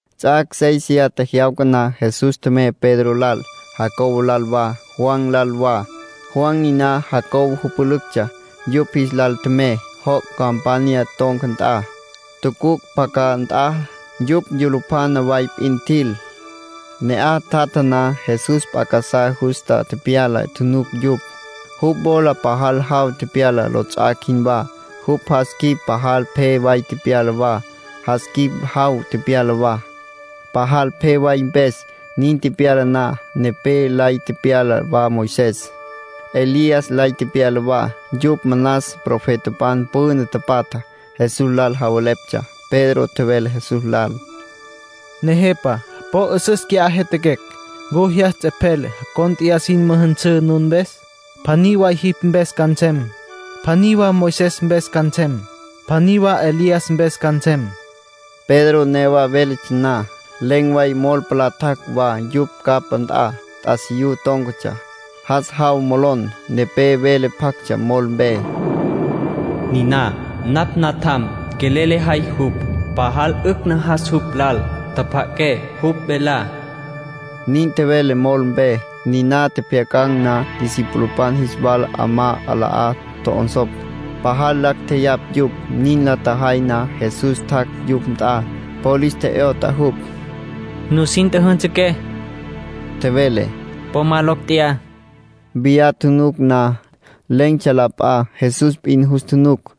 Ts'ac' séisiya tjejyawca na, Jesús tjemey Pedro lal, Jacobo lal wa, Juan lal wa. Juan niná Jacobo jüpülüctsja. Yupj jis lal tjemey joc' campanya ton̈ca nt'a, tucuc' pacá nt'a. Yupj yulupjana way p'in tjil. Ne'aj tjatja na, Jesús p'a casá justa tepyala tjunuc yupj. Jupj wola pajal jaw tepyala lots'ac' jinwá. Jupj jas quip pajal pje way tepyala wa. Jas quip jaw tepyala wa, pajal pje way mpes. Nin tepyala na, nepé lay tepyala wa Moisés. Elías lay tepyala wa. Yupj manas profetapan püna tapatjá. Jesús lal javeleptsja. Pedro tjevele Jesús lal: —Nejepa, po 'üsüs qui'á jyatjaquecj. ¿Ncu jyas ts'epjel cónt'eya sin müjünsǘ nun mpes? Pjaní way jipj mpes ca nsem, pjaní wa Moisés mpes ca nsem, pjaní wa Elías mpes ca nsem. Pedro newa véletsja na, len̈ way mol palá tjac' wa yupj capá nt'a. T'asiyú tón̈catsja. Jas jawtsja molon. Nepé vele pjactsja mol mpe. “Niná napj Natjam —tjevele—. Quelel lejay jupj. Pajal 'ücj najas jupj lal. Tjapja'aqué jupj velá”, nin tjevele mol mpe. Niná tjepjyacan̈ na, discipulopan jis wala 'amá 'alá tjo'onsopj. Pajal lacj tjeyapj yupj. Nin la tjajay na, Jesús tjac' yupj nt'a. Po lis tje'yot'a jupj. —Nusin tjüjünsǘ —tjevele—. Po ma locj tjeyá. Viyá tjunuc na, len̈tsja la p'a. Jesús p'in jus tjunuc.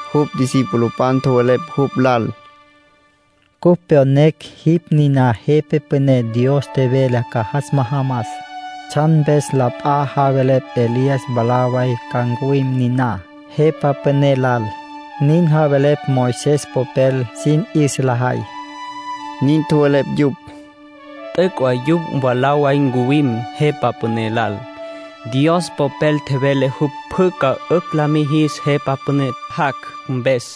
Jupj discipulopan tjowelepj jupj lal: —Cupj pyonecj jipj niná Jepa Püné Dios tjevele ca jas majamas. ¿Tsjan mpes la p'a javelepj Elías mwalá way ca ncuwim niná Jepa Püné lal? Nin javelepj Moisés popel sin 'yüsa lajay —nin tjowelepj yupj. —T'üc' way jupj mwalá way ncuwim Jepa Püné lal —tjevele Jesús—. Dios Popel tjevele jupj pjü ca 'ücj la mijis Jepa Püné jac' mpes.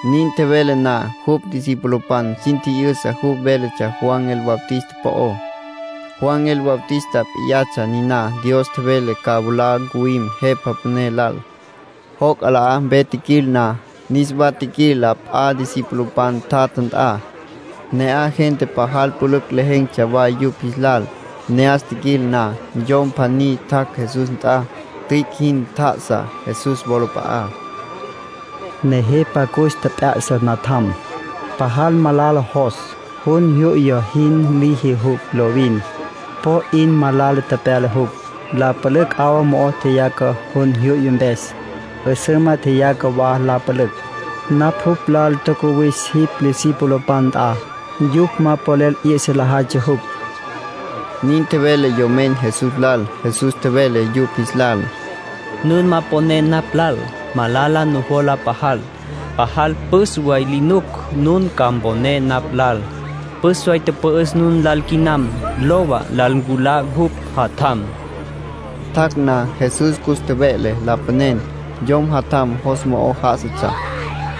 Nin tjevele na, jupj discipulopan sin tji'yüsa jupj véletsja Juan el Bautista po'ó. Juan el Bautista p'iyatsja niná Dios tjevele ca mwalá ncuwim Jepa Püné lal. Joc' 'alá mpe tjiquil na, niswa tjiquil la p'a discipulopan tjatja nt'a. Ne'aj gente pajal pülücj lejen̈tsja wa yupj jis lal. Ne'as tjiquil na, yom pjaní tjac' Jesús nt'a. Tüic' jin tjá'asa Jesús wolap'a'á. —Nejepa, cus tjep'ya'sa natjam —tjevele—. Pajal malala jos. Jun jyu'ya jin liji jupj lovin. Po 'in malala tepyala jupj. La pülücj 'awa mo'o tjeyaca jun jyu'ya mpes. 'Üsüma tjeyaca wa la pülücj. Napj jupj lal tjacuwis jipj discipulopan nt'a. Yupj ma polel 'yü'sa lajaytsja jupj —nin tjevele yomen Jesús lal. Jesús tjevele yupj jis lal: —Nun ma poné napj lal. Malala nujola pajal. Pajal püs way li nuc nun ca mponé napj lal. Püs way tüpü'üs nun lal quinam. Lowa, lal nculá jupj jatjam. Tjac' na, Jesús cus tjeve'le lapanen, yom jatjam jos mo'o já'asatsja.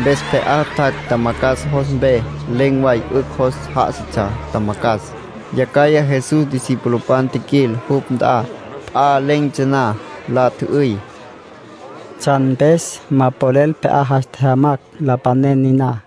Mpes pje'á tjac' tjamacjas jos mpe. Len̈ way 'ücj jos já'asatsja tjamacjas. Yacjaya Jesús discipulopan tjiquil jupj nt'a, p'a len̈tsja na. La tjü'üy: —¿Tsjan mpes ma polel pje'á jas tjejyamacj lapanen niná?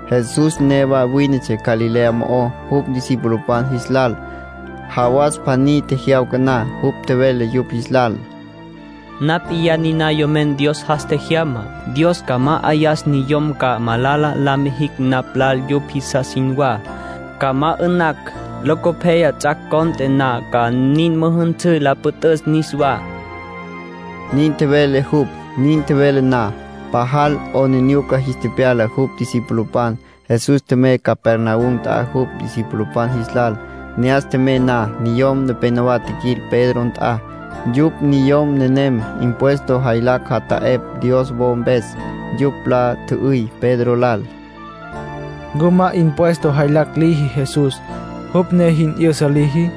Jesús newa wínetsja Galilea mo'ó jupj discipulopan jis lal. Jawas pjaní tjejyawca na, jupj tjevele yupj jis lal: “Napj p'iyá niná Yomen Dios jas tjejyamá. Dios ca ma'ayas niyom ca malala la mijicj napj lal yupj jisas jinwá. Ca ma 'ü'nacj, locopyaya ts'ac' cont'e na ca nin müjünsǘ la püt'üs niswá”, nin tjevele jupj. Nin tjevele na, pajal 'aplijila jis tepyala jupj discipulopan. Jesús tjemey Capernaum nt'a jupj discipulopan jis lal. Ne'as tjemey na, niyom nepénowa tjiquil Pedro nt'a. Yupj niyom nenem impuesto jaylacj jata'epj Dios wo mpes. Yupj la tjü'üy Pedro lal: —¿Ncu ma impuesto jaylacj liji Jesús, jupj ne jin 'yüsa liji?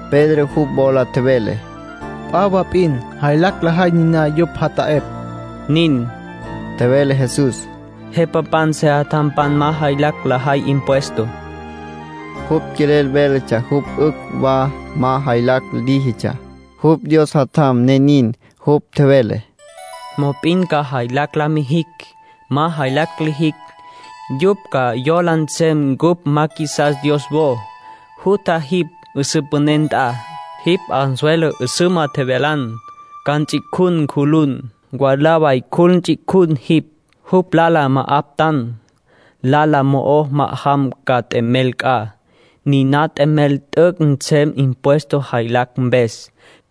Pedro jupj wola tjevele: —P'a wa p'in jaylacj lajay niná yupj jata'epj. —Nin —tjevele Jesús—. Jepapan sejatjampan ma jaylacj lajay impuesto. (Jupj quelel véletsja jupj 'ücj wa ma jaylacj líjitsja. Jupj Dios Jatjam, ne nin.) Jupj tjevele: —Mop'in ca jaylacj la mijicj. Ma jaylacj lijicj, yupj ca yola nsem cupj ma qjuisas Dios wo. Jutja jipj 'üsǘ püné nt'a. Jipj anzuelo 'üsüma tjevyala. Ca nts'icjun cjulun. Mwalá way cjul ts'icjucj jipj, jupj lala ma'aptan. Lala mo'o ma'ajam ca t'emel c'a. Niná t'emel t'üc' nsem impuesto jaylacj mpes.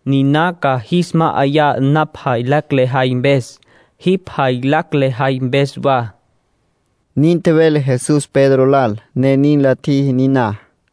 Niná ca jis ma'ayan napj jaylacj lejay mpes, jipj jaylacj lejay mpes wa —nin tjevele Jesús Pedro lal. Ne nin la tjiji niná.